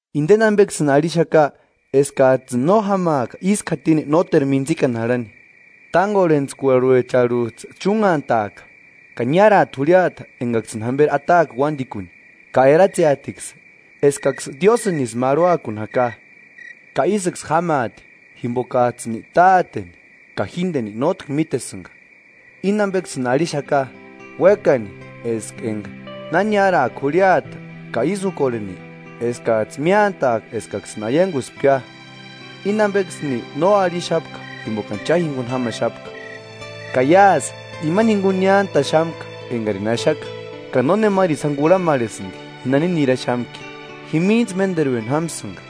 Indeni ambeksïni arhixaka eskajtsïni no jámaaka ísku jatini nóteru mintsikani jarhani. Tángorhentskuarhuecharhujtsï chúnhantaaka. Ka niáraati jurhiata engaksïni jamberi ataaka uandikuni ka eratseatiksï eskaksï Diósïnisï marhuakuni jaka. Ka ísïksï jámaati jimbokajtsïni Táteni ka jíndeni nótki mítesïnga Íni ambeksïni arhixaka, uékani eska enga na niáraaka jurhiata ka ísï úkorheni, eskajtsï miántaaka eskaksïni aianguspkia. Espiritu Sántuntsïni axacheati “Íni ambeksïni no arhixapka jimbokani cha jinguni jámaxapka. Ka iásï imani jinguni niántaxamka engarini axaka, ka nónemarini sáni kurhamarhesïndi ji nani niraxamki; jimintsï ménderueni jámsïnga,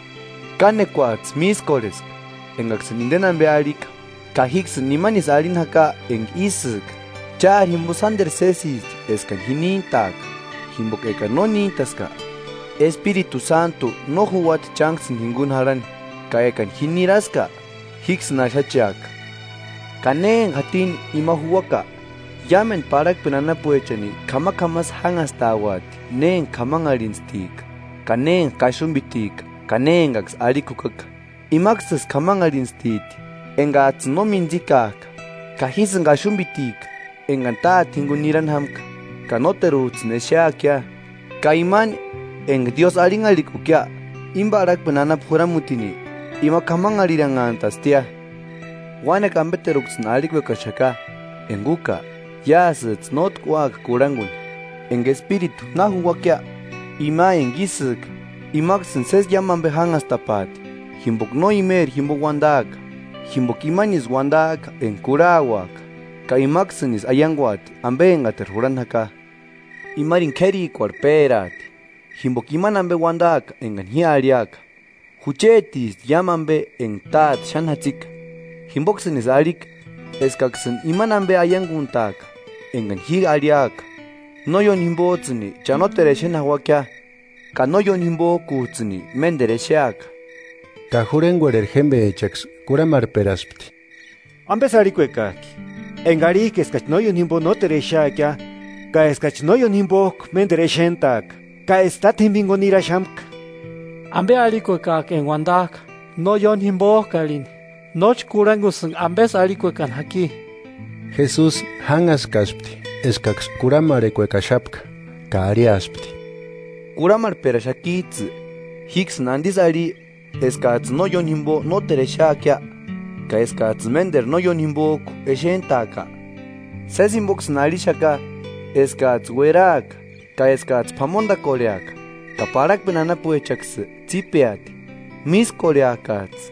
kánekuajtsï mískorheska engaksïni indeni ambe arhika. Ka jíksïni imanisï arhini jaka enga ísïka: Chári jimbo sánderu sésisti eskani ji níntaaka. Jimboka ekani no níntaska, Espiritu Sántu no juuati chánksïni jinguni jarhani; ka ekani ji niraska, jíksïni axacheaka. Ka na enga jatini ima juuaka, iámendu parhakpeni anapuechani k'amak'amasï jánhastauati ne enga k'amanharhintstika ka ne enga kaxumbitika ka ne engaksï arhikua jukaka; imaksïsï k'amanharhintstiti engajtsïni no mintsikajka; ka jísïni kaxumbitika, engani Táte jinguni nirani jámka, ka nóterujtsïni exeakia; ka imani enga Diósï arhinharhikukia, íni parhakpeni anapu juramutini, ima k'amanharhiranhantastia. Uánekua ambeteruksïni arhikuekaxaka, enga úka, iásïjtsï nótki úaka kurhanguni. Enga Espiritu na juuakia, ima enga ísïka, imaksïni sési iámu ambe jánhastapaati; jimboka no imeri jimbo uandaaka, jimboka imanisï uandaaka enga kurhauaka, ka imaksïni aianguati ambe engateru jurhani jaka. Imarini k'érikuarhu péraati, jimboka imani ambe uandaaka engani ji arhiaka. Juchetisti iámu ambe enga Táte xáni jatsika. Jimboksïnisï arhika eskaksïni imani ambe aianguntaaka engani ji arhiaka.” “No ióni jimbojtsïni cha nóteru exeni jauakia, ka no ióni jimbojkujtsïni ménderu exeaka.” Ka jurhengorheri jémbechaksï kurhamarhperaspti: –¿Ambesï arhikuekajki? Enga arhijka eskachi no ióni jimbo nóteru exeakia, ka eskachi no ióni jimbojku ménderu exentaaka, ka eska Tátjemba jinguni niraxamka. ¿Ambe arhikuekajki enga uandajka no ióni jimbojku arhini? Nóchi kurhangusïnga ambesï arhikuekani jaki. Jesusi jánhaskaspti eskaksï kurhamarhekuekaxapka ka arhiaspti: –¿Kurhamarhperaxakijtsï jíksïni andisï arhi eskajtsïni no ióni jimbo nóteru exeakia ka eskajtsïni ménderu no ióni jimbojku exentaaka? Sési jimboksïni arhixaka eskajtsï ueraska ka eskajtsï p'amondakorheaka, ka parhakpeni anapuechaksï tsípeati. Mískorheakajtsï,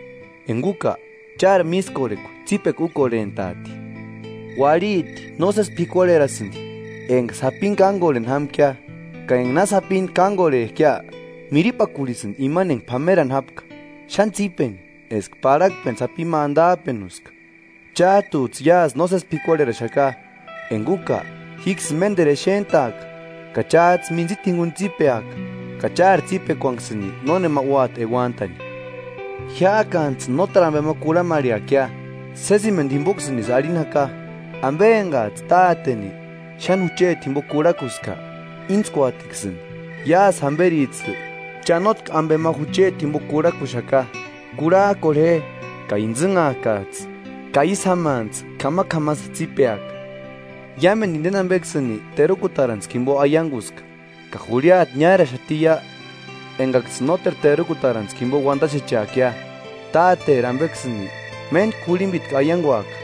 enga úka, chári mískorhekua tsípekua úkorhentaati. Uarhiti nósesi p'ikuarherasïndi enga sapini kángorheni jámkia; ka enga na sapini kángorhejkia, miripakurhisïndi imani enga p'amerani jápka, xáni tsípeni eska parhakpeni sapi ma andajpenuska. Chájtujtsï iásï nósesi p'ikuarheraxaka, enga úka jíksïni ménderu exentaaka ka chájtsï mintsita jinguni tsípeaka ka chári tsípekuanksïni nónema úati euantani. “Jiájkantsïni nóteru ambe ma kurhamarheakia. Sésimendu jimboksïnisï arhini jaka: Ambe engajtsï Táteni xáni jucheti jimbo kurhakuska, íntskuatiksïni. Iásï jamberijtsï cha nótki ambe ma jucheti jimbo kurhakuxaka. Kurhajkorhe je ka intsïnhaakajtsï, ka ísï jámantsï k'amak'amasï tsípeaka.” “Iámendu indeni ambeksïni terukutarantskua jimbo aianguska. Ka jurhiata niáraxatiia engaksïni nóteru terukutaratskua jimbo uandaxecheakia; Táteri ambeksïni méntku jurhimbitku aianguaka.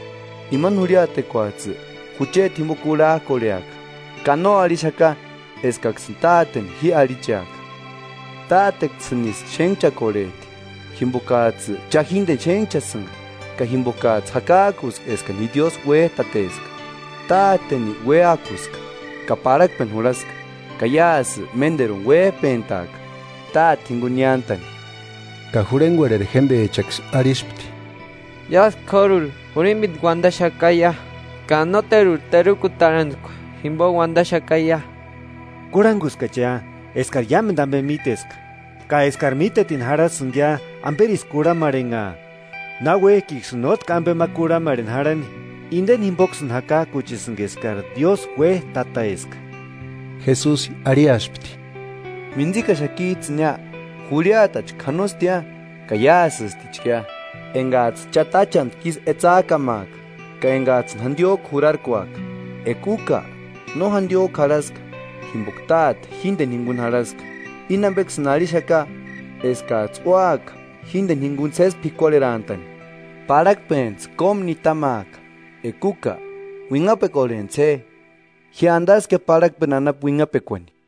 Imani jurhiatekuajtsï jucheti jimbo kurhajkorheaka; ka no arhixaka eskaksïni Táteni ji arhicheaka. Táteksïnisï xénhchakorhejti jimbokajtsïni cha jíndeni xénhchasïnga ka jimbokajtsï jakajkuska eskani ji Diósï uéjtateska. Táteni uéakuska ka parhakpeni jurhaska. Ka iásï ménderuni uéjpentaaka Táte jinguni niántani.” Ka jurhengorheri jémbechaksï arhispti: –Iásï k'óruri jurhimbitku uandaxakaia, ka nóteruri terukutarantskua jimbo undaxakaia. Kurhanguskachia eskari iámendu ambe míteska ka eskari mítetini jarhasïngia amberisï kurhamarhenhaa náuekiksïni nótki ambe ma kurhamarheni jarhani. Indeni jimboksïni jakajkuchesïnga eskari Diósï uéjtateska. Jesusi arhiaspti: –¿Mintsikaxakijtsïnia? Jurhiatachka janostia ka iásïstichkia, engajtsï cha táchantku isï etsajkamaaka ka engajtsïni jandiójku jurarkuaka. Eka úka no jandiójku jarhaska, jimboka Táte jíndeni jinguni jarhaska. Íni ambeksïni arhixaka eskajtsï úaka jíndeni jinguni sési p'ikuarherantani. Parhakpentsï kómu nitamaaka. Eka úka uinhapekorhentsï je: Ji andaskia parhakpeni anapu uinhapekuani.